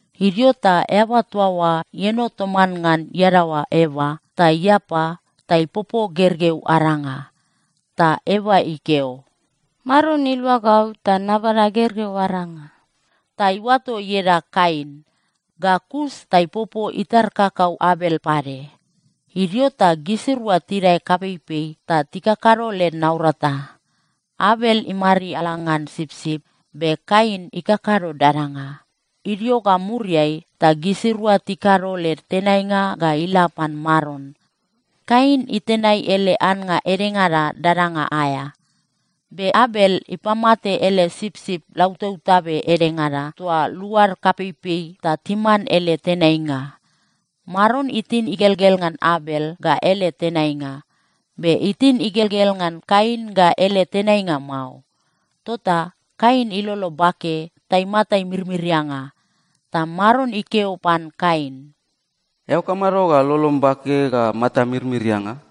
Idio ta eaba toa oa ieno toman ngan iadaoa Eva, ta iapa ta ipopo gergeu aranga. Ta Eva ikeo, “Maron ilua gau ta nabada gergeu aranga.” Ta iuato ieda Kain. Ga kus ta ipopo itar kakau Abel pade. Idio ta gisirua tidae kapeipei ta tikakado led naurata. Abel imariala ngan sipsip, be Kain ikakado dadanga. Idio ga muriai, ta gisirua tikado led tenainga ga ila pan Maron. Kain itenai ele annga edengada dadanga aea. Be Abel ipamate ele sipsip lautabtabe edengada toa luad kapeipei ta timan ele tenainga. Maron itin igelgel ngan Abel ga ele tenainga. Be itin igelgel ngan Kain ga ele tenainga mao. Tota Kain ilolo bake ta imata imirmirianga. Ta Maron ikeo pan Kain, “Eao kamado ga lolom bake ga matam imirmirianga?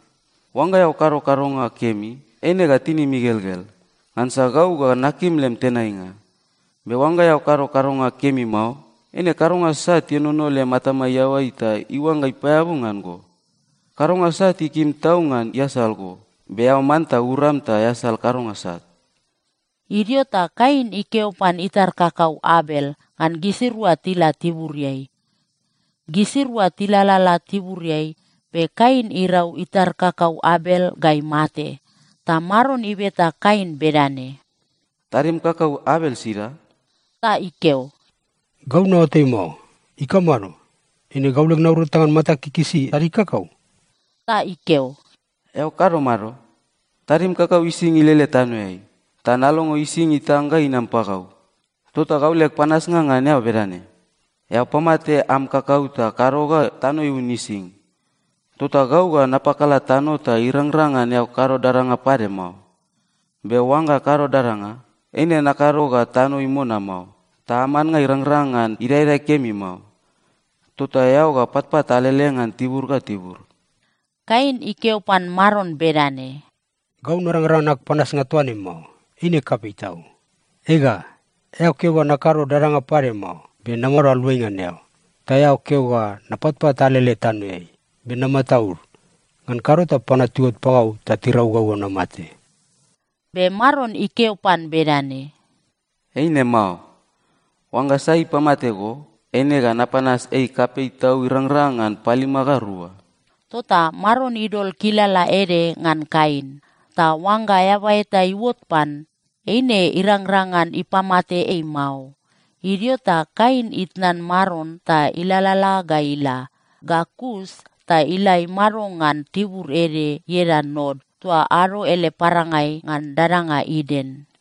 Oangga eao kado kadonga kemi, eine ga tinim igelgel, ngansa gau ga nakim lem tenainga. Be oangga eao kado kadonga kemi mao, eine kadonga sat ienono lem atama iaoai ta iuangga ipaeabu ngan go. Kadonga sat ikim tau ngan iasal go, be eao manta uram ta easal kadonga sat.” Idio ta Kain ikeo pan itar kakau Abel ngan gisirua tila tiburiai. Gisirua tilalala tiburiai, be Kain irau itar kakau Abel ga imate. Ta Maron ibeta Kain bedane, “Tadim kakau Abel sida?” Ta ikeo, “Gau naoatai mao. Ikamado? Eine gau leg naurata ngan matag ikikisi tadig kakau?” Ta ikeo, “Eao kado mado? Tadim kakau ising ilele tanoeai, ta nalongo ising itang ga inam pagau! Tota gau leg panasnga ngan eao bedane: Eao pamate am kakau ta kado ga tano iun ising. Tota gau ga napakala tano ta irangrang ngan eao kado dadanga pade mao. Be oangga kado dadanga, eine nakado ga tano imona mao, ta am annga irangrang ngan idaedae kemi mao. Tota eao ga patpat alele ngan tibur ga tibur.” Kain ikeo pan Maron bedane, “Gau narangrang ngan ag panasnga toa ne mao. Eine kapei tau. Ega, eao keo ga nakado dadanga pade mao, be namado aluai ngan eao. Ta eao keo ga napatpat alele tanoeai. Be namataud. Ngan kado ta panua tiuot pagau ta tirau gau ga namate.” Be Maron ikeo pan bedane, “Eine mao. Oangga sai ipamate go, eine ga napanas ei kapei tau irangrang ngan palima ga rua.” Tota Maron idol kilala ede ngan Kain, ta oangga eaba eta iuot pan, eine irangrang ngan ipamate ei mao. Idio ta Kain itnan Maron ta ilalala ga ila. Ga kus ta ila imado ngan tibur ede ieda Nod toa ado ele parangai ngan dadanga Iden.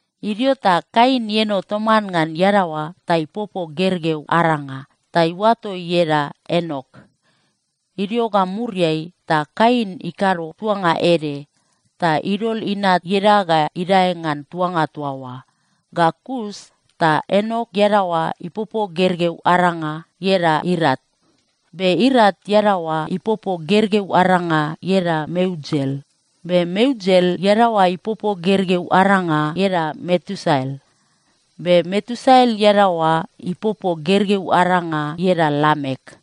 Idio ta Kain ieno toman ngan iadaoa ta ipopo gergeu aranga ta iuato ieda Enok. Idio ga muriai ta Kain ikado tuanga ede, ta idol inat ieda ga idae ngan tuanga toa oa. Ga kus ta Enok iadaoa ipopo gergeu aranga ieda Irat. Be Irat iadaoa ipopo gergeu aranga ieda Meujael. Be Meujael iadaoa ipopo gergeu aranga ieda Metusael. Be Metusael iadaoa ipopo gergeu aranga ieda Lamek.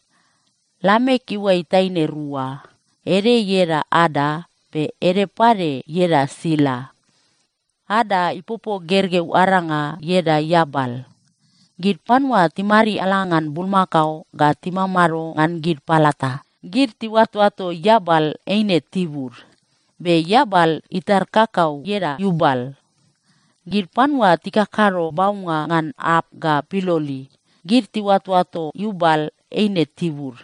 Lamek iuai taine rua. Ede ieda Ada, be ede pade ieda Sila. Ada ipopo gergeu aranga ieda Iabal. Gid panua timariala ngan bulmakao ga timamado ngan gid palata, gid tiuatoato Iabal eine tibud. Be Iabal itar kakau ieda Iubal. Gid panua tikakado baunga ngan arp ga piloli, gid tiuatoato Iubal eine tibud.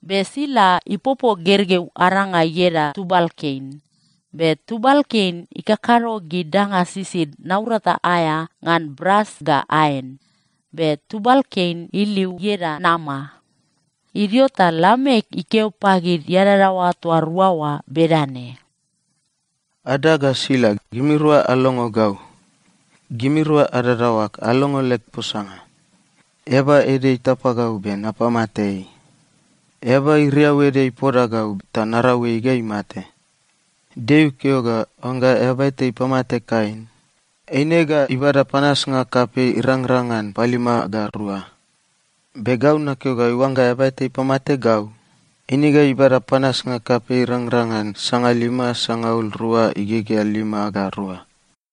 Be Sila ipopo gergeu aranga ieda Tubalkein. Be Tubalkein ikakado gid danga sisid naurata aea ngan bras ga aen. Be Tubalkein iliu ieda Nama. Idio ta Lamek ikeo pagid iadadaoa toa rua oa bedane, “Ada ga Sila, gimirua alongo gau. Gimirua adadaoag alongo leg posanga. Eaba ede itapa gau, be napamate ei. Eaba iriau ede ipoda gau, ta narau ei ga imate. Deo ikeo ga oangga eaba eta ipamate Kain, eine ga ibada panasnga kapei irangrang ngan palima ga rua. Be gau nakeo ga oangga eaba eta ipamate gau, eine ga ibada panasnga kapei irangrang ngan sangalima sangaul rua igegea lima ga rua.”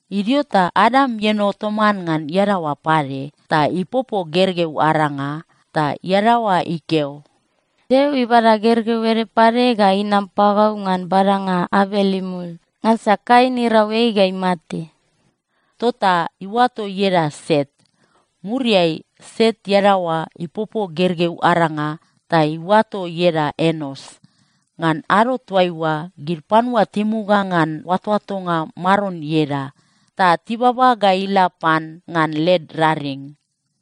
Idio ta Adam ieno toman ngan iadaoa pade, ta ipopo gergeu aranga. Ta iadaoa ikeo, “Deo ibada gergeu ede pade ga inam pagau ngan badanga Abel imul. Ngansa Kain irau ei ga imate.” Tota iuato ieda Set. Muriai Set iadaoa ipopo gergeu aranga ta iuato ieda Enos. Ngan ado toaiua, gid panua timuga ngan oatoatonga Maron ieda, ta tibaba ga ila pan ngan led raring.